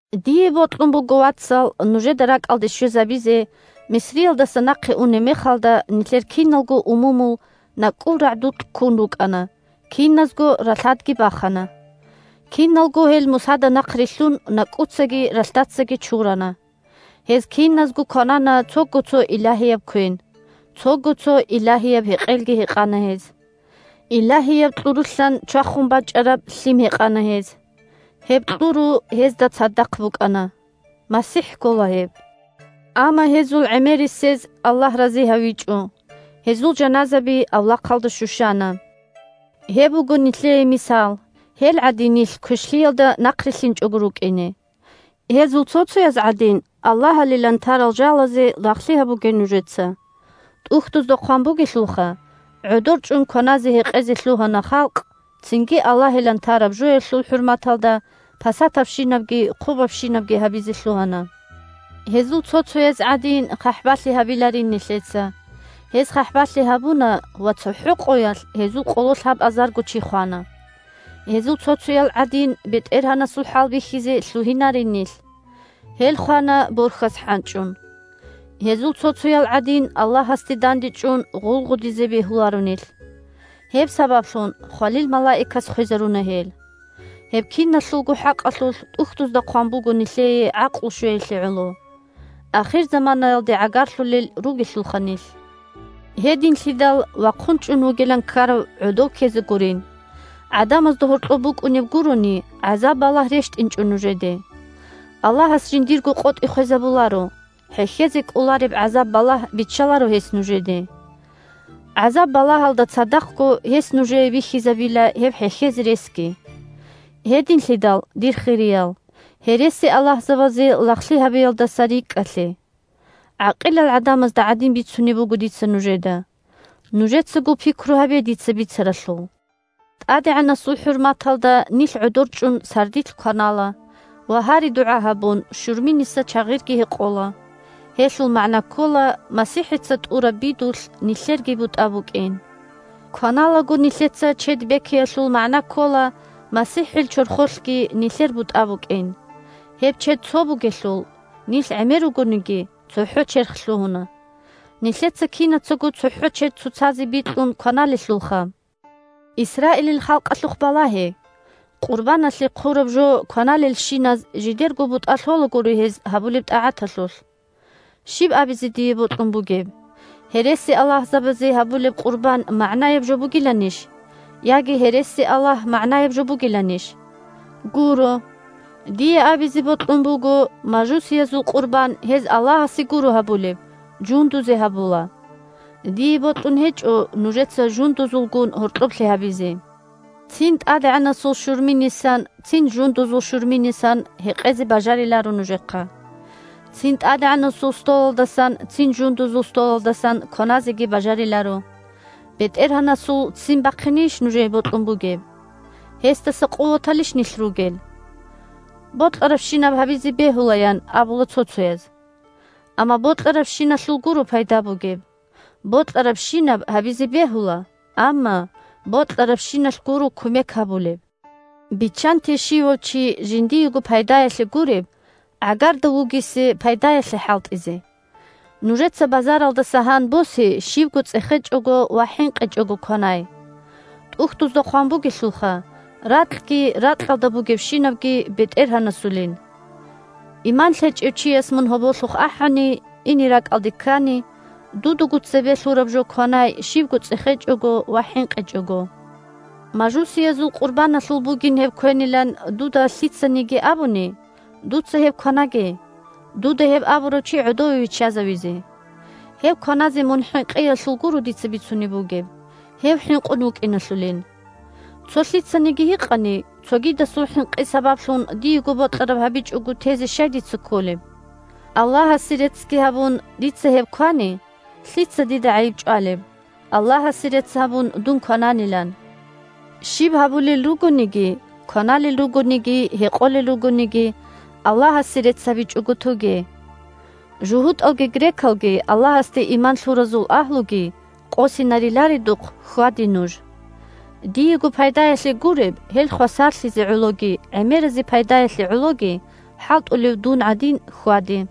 Дие бокьун буго, вацал, нужеда ракӀалде щвезабизе: Мисриялдаса нахъе унеб мехалда нилъер киналго умумул накӀкӀул рагӀдукь ккун рукӀана, киназго ралъадги бахана. Киналго гьел Мусада нахърилълъун накӀкӀуцаги ралъдацаги чурана. Гьез киназго кванана цого-цо илагьияб квен, цого-цо илагьияб гьекъелги гьекъана гьез. Илагьияб кьурулъан чвахун бачӀараб лъим гьекъана гьез. Гьеб кьуру гьезда цадахъ букӀана. МасихӀ ккола гьеб. Амма гьезул гӀемерисез Аллагь рази гьавичӀо – гьезул жаназаби авлахъалда щущана. Гьеб буго нилъее мисал – гьел гӀадин нилъ квешлъиялда нахърилълъинчӀого рукӀине. Гьезул цо-цояз гӀадин аллагьалилан тарал жалазе лагълъи гьабуге нужеца. ТӀухьдузда хъван бугелъулха: «ГӀодор чӀун кваназе-гьекъезе лъугьана халкъ, цинги аллагьилан тараб жоялъул хӀурматалда пасатабщинабги хъубабщинабги гьабизе лъугьана». Гьезул цо-цояз гӀадин хъахӀбалъи гьабиларин нилъеца. Гьез хъахӀбалъи гьабуна – ва цохӀо къоялъ гьезул къоло лъабазарго чи хвана. Гьезул цо-цоял гӀадин, БетӀергьанасул хӀалбихьизе лъугьинарин нилъ. Гьел хвана борхьаз хӀанчӀун. Гьезул цо-цоял гӀадин, Аллагьасде дандечӀун, гъулгъудизе бегьуларо нилъ. Гьеб сабаблъун хвалил малаикас хвезаруна гьел. Гьеб киналъулго хӀакъалъулъ ТӀухьдузда хъван буго нилъее гӀакълу щвеялъе гӀоло. Ахирзаманаялде гӀагарлъулел ругелъулха нилъ. Гьединлъидал, вахъун чӀун вугилан ккарав гӀодов ккезе гурин. ГӀадамазда гьоркьоб букӀунеб гурони гӀазаб-балагь рещтӀинчӀо нужеде. Аллагьас жиндирго къотӀи хвезабуларо – хӀехьезе кӀолареб гӀазаб-балагь биччаларо гьес нужеде. ГӀазаб-балагьалда цадахъго гьес нужее бихьизабила гьеб хӀехьезе ресги. Гьединлъидал, дир хириял, гьересиаллагьзабазе лагълъи гьабиялдаса рикӀкӀалъе. ГӀакъилал гӀадамазда гӀадин бицунеб буго дица нужеда. Нужецаго пикру гьабе дица бицаралъул. ТӀадегӀанасул хӀурматалда нилъ гӀодор чӀун сардилъ кванала ва, гьари-дугӀа гьабун, щурминиса чагъирги гьекъола, – гьелъул магӀна ккола МасихӀица тӀураб бидулъ нилъерги бутӀа букӀин. Кваналаго нилъеца чед бекиялъул магӀна ккола МасихӀил чорхолъги нилъер бутӀа букӀин. Гьеб чед цо бугелъул, нилъ гӀемер ругониги, цохӀо черх лъугьуна. Нилъеца кинацаго цохӀо чед цоцазе бикьун кваналелъулха! Исраилил халкъалъухъ балагье: къурбаналъе хъураб жо кваналелщиназ жидерго бутӀа лъолагури гьез гьабулеб тӀагӀаталъулъ. Щиб абизе дие бокьун бугеб: гьересиаллагьзабазе гьабулеб къурбан магӀнаяб жо бугиланищ? яги гьересиаллагь магӀнаяб жо бугиланищ? Гуро! Дие абизе бокьун буго: мажусиязул къурбан гьез Аллагьасе гуро гьабулеб, жундузе гьабула. Дие бокьун гьечӀо нужеца жундузулгун гьоркьоблъи гьабизе. Цин ТӀадегӀанасул щурминисан, цин жундузул щурминисан гьекъезе бажариларо нужехъа. Цин ТӀадегӀанасул столалдасан, цин жундузул столалдасан кваназеги бажариларо. БетӀергьанасул ццин бахъинейищ нужее бокьун бугеб? Гьесдаса къуваталищ нилъ ругел? «Бокьарабщинаб гьабизе бегьула», – ян абула цо-цояз. Амма бокьарабщиналъул гуро пайда бугеб. «Бокьарабщинаб гьабизе бегьула». Амма бокьарабщиналъ гуро кумек гьабулеб. Биччанте щивав чи жиндиего пайдаялъе гуреб, гӀагарда вугесе пайдаялъе хӀалтӀизе. Нужеца базаралдаса гьан босе щибго цӀехечӀого ва хӀинкъичӀого кванай. ТӀухьдузда хъван бугелъулха: «Ракьги ракьалда бугебщинабги БетӀергьанасулин». Иман лъечӀев чияс мун гьоболлъухъ ахӀани, ине ракӀалде ккани, дудаго цебе лъураб жо кванай щибго цӀехечӀого ва хӀинкъичӀого. Мажусиязул къурбаналъул бугин гьеб квенилан дуда лъицаниги абуни, дуца гьеб кванаге, дуда гьеб абурав чи гӀодове виччазавизе. Гьеб кваназе мун хӀинкъиялъул гуро дица бицунеб бугеб, гьев хӀинкъун вукӀиналъулин. Цо лъицаниги гьикъани: «Цогидасул хӀинкъи сабаблъун диего бокьараб гьабичӀого тезе щай дица кколеб? Аллагьасе реццги гьабун дица гьеб квани, лъица дида гӀайиб чӀвалеб, Аллагьасе рецц гьабун дун квананилан?» Щиб гьабулел ругониги – кваналел ругониги, гьекъолел ругониги, – Аллагьасе рецц гьабичӀого тоге. ЖугьутӀалги, грекалги, Аллагьасде иман лъуразул агьлуги къосинариларедухъ хьваде нуж. Диего пайдаялъе гуреб, гьел хвасарлъизе гӀологи гӀемеразе пайдаялъе гӀологи хӀалтӀулев дун гӀадин хьваде.